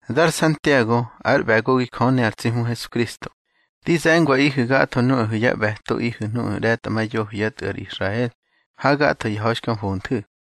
Dar Santiago, ár ꞌbe̱gogi Jö ne ar tsi Hmu Hesukristo, di ze̱ngwaꞌihu̱ gatho nuꞌahu̱ yá ꞌbe̱toꞌihu̱ nuꞌu̱ ꞌre̱tꞌamayoho yá tꞌu̱ ar Israel ha gatho ya ha̱i xka mfonthu̱.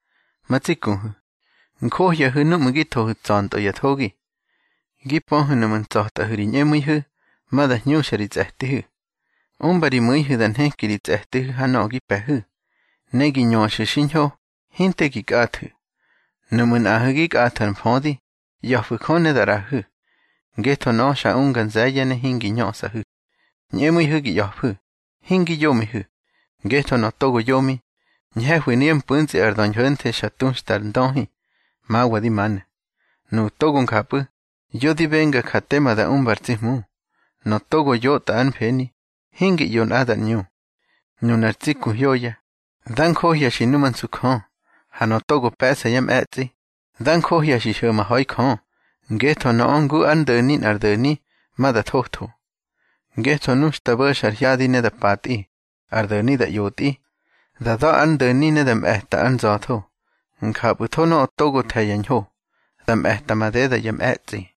Ma tsi kuhu̱, njohyahu̱ núꞌmu̱ gi thohu̱ tsa̱ntꞌö ya thogi. Gi pöhu̱ nuꞌmu̱ ntsꞌa̱tꞌahu̱ ri ñꞌemu̱ihu̱, ma da hñuxa ri tsꞌe̱tihu̱. Umba ri mu̱ihu̱ da nheki ri tsꞌe̱tihu̱ ha nöꞌö gi pe̱hu̱, ne gi ñöxu̱ xiñho, hinte gi kꞌathu̱. Nuꞌmu̱ nꞌaꞌahu̱ gi kꞌathu̱ ar mfödi, ꞌya̱fu̱ Jö ne da ꞌraꞌahu̱, ngetho nöꞌö xa unga nze̱ye̱ ne hingi ñösꞌahu̱. Ñꞌemu̱ihu̱ gi ꞌya̱fu̱, hingi yomihu̱. Ngetho nöꞌö togo yomi, ñhe̱hwi nuyá mpu̱ntsꞌi ar döñho̱nthe xa tuxta ar ndöhi, mawa di manu̱. Nuꞌu̱ togo njapꞌu̱, yo di benga ja tema da umba ar tsi Hmu. Nöꞌö togo yótꞌa ár mfeni, hingi ꞌyo nꞌadar ꞌñu. Nunar tsi ku hyoya, dá njohya xi numansu Jö. Ha nöꞌö togo pe̱ꞌsa yá mꞌe̱tsꞌi, dá njohya xi hyo̱ma ha̱i Jö, ngetho nöꞌö ngu ár ndo̱ni nꞌar do̱ni, ma da thotho. Ngetho nu xta bo̱xa ar hyadi ne da patꞌi, ar do̱ni da ꞌyotꞌi, da da̱ ár ndo̱ni ne da mꞌe̱ta ár nza̱tho. Njapꞌu̱tho nöꞌö togo the̱ ya ñho, da mꞌe̱ta madeda yá mꞌe̱tsꞌi.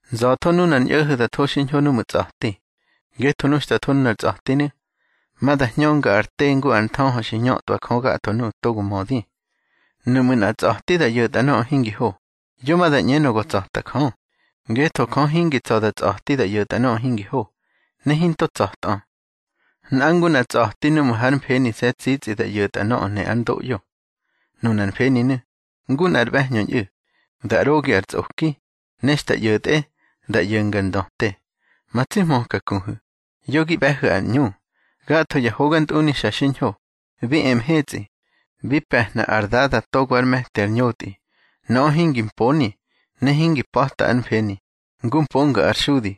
Nza̱tho nunar ñꞌo̱ho̱ da tho xiñho núꞌmu̱ tsꞌa̱ti. Ngetho nu xta tho nunar tsꞌa̱tinu̱, ma da hñönga ar te ngu ar nthöhö xi ñötꞌwa Jö gatho nuꞌu̱ togo mödi. Nuꞌmu̱ nꞌa tsꞌa̱ti da ꞌyo̱tꞌa nöꞌö hingi ho, yo ma da ꞌñenö go tsa̱ta Jö, ngetho Jö hingi tsa̱ da tsꞌa̱ti da ꞌyo̱tꞌa nöꞌö hingi ho, ne hinto tsa̱tꞌö. Nꞌa ngu nꞌa tsꞌa̱ti núꞌmu̱ hár mfenise̱ tsitsꞌi da ꞌyo̱tꞌa nöꞌö ne ár ndoꞌyo. Nunar mfeninu̱, ngu nꞌar ꞌbe̱hñö ñꞌu̱, da ꞌrogi ar tsꞌoki, ne xta ꞌyo̱tꞌe, da ꞌyo̱nga ar ndöte. Ma tsi hmöka kuhu̱, yo gi ꞌbe̱hu̱ ar ꞌñu. Gatho ya hogantꞌuni xa xiñho, bi e mhetsꞌi, bi pe̱hna ar Dada togo ár me̱ti ar ñotꞌi. Nöꞌö hingi mponi, ne hingi pa̱ta ár mfeni, ngu mponga ar xudi.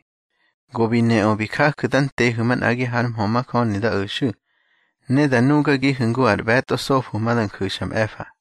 Go bi neꞌö bi jaju̱ da ntehu̱ manꞌagi har mhö majöni da o̱xu̱, ne da nugagihu̱ ngu ar ꞌbe̱tꞌo sofo ma da nju̱xa mꞌe̱fa.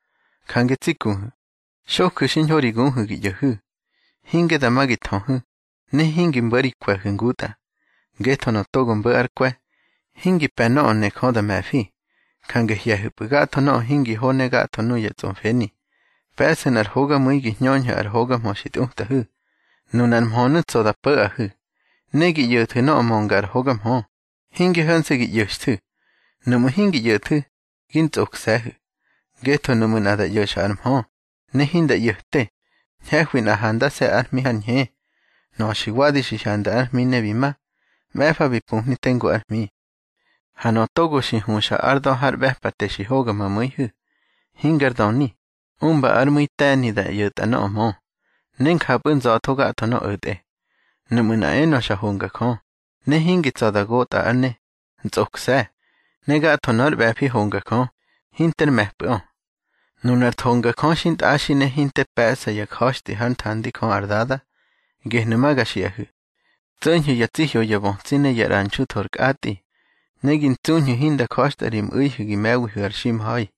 Jange tsi kuhu̱, xoju̱ xiñho ri guhu̱ gi ꞌyo̱hu̱, hinge dama gi thöhu̱, ne hingi mbo̱ ri kwe̱hu̱ ngutꞌa. Ngetho nöꞌö togo mbo̱ ár kwe̱, hingi pe̱ nöꞌö ne Jö da me̱fi. Jange hye̱hu̱pꞌu̱ gatho nöꞌö hingi ho ne gatho nuya tsꞌomfeni. Pe̱ꞌsu̱ nꞌar hogamu̱i gi hñöñhu̱ ar hoga mhö xi tꞌutꞌahu̱. Nunar mhönu̱ tsa̱ da po̱ꞌahu̱. Ne gi ꞌyo̱thu̱ nöꞌö mönga ar hoga mhö, hinge ho̱nse̱ gi ꞌyo̱xthu̱. Nuꞌmu̱ hingi ꞌyo̱thu̱, gi ntsꞌokse̱hu̱. Ngetho nuꞌmu̱ nꞌa da ꞌyo̱xa ar mhö, ne hinda ꞌyo̱ꞌte, ñhe̱hwi nꞌa handase̱ ár hmi har ñhe. Nöꞌö xi wadi xi hyanda ár hmi ne bi ma, mꞌe̱fa bi pumhni tengu ár hmi. Ha nöꞌö togo huxa ár da̱ har ꞌbe̱pate xi hoga ma mu̱ihu̱, hingar döni, umba ár mu̱i te̱ni da ꞌyo̱tꞌa nöꞌö mö, ne njapꞌu̱ nza̱tho gatho nöꞌö o̱tꞌe. Nuꞌmu̱ nꞌa enö xa honga Jö, ne hingi tsa̱ da gotꞌa ár ne, ntsꞌokse̱, ne gatho nór ꞌbe̱fi honga Jö, hinter mꞌe̱pꞌu̱ꞌö. Nunar thongajö xintꞌaxi ne hinte pe̱ꞌsa ya ja̱xtꞌi hár nthandi Jö ar Dada, gehnu̱ ma ga xiꞌahu̱: Tso̱ñhu̱ ya tsi hyoyabötsi ne ya ꞌranxu tho ar kꞌatꞌi, ne gi ntsuñhu̱ hinda ja̱xtꞌa ri mꞌu̱ihu̱ gi me̱wihu̱ ar ximha̱i.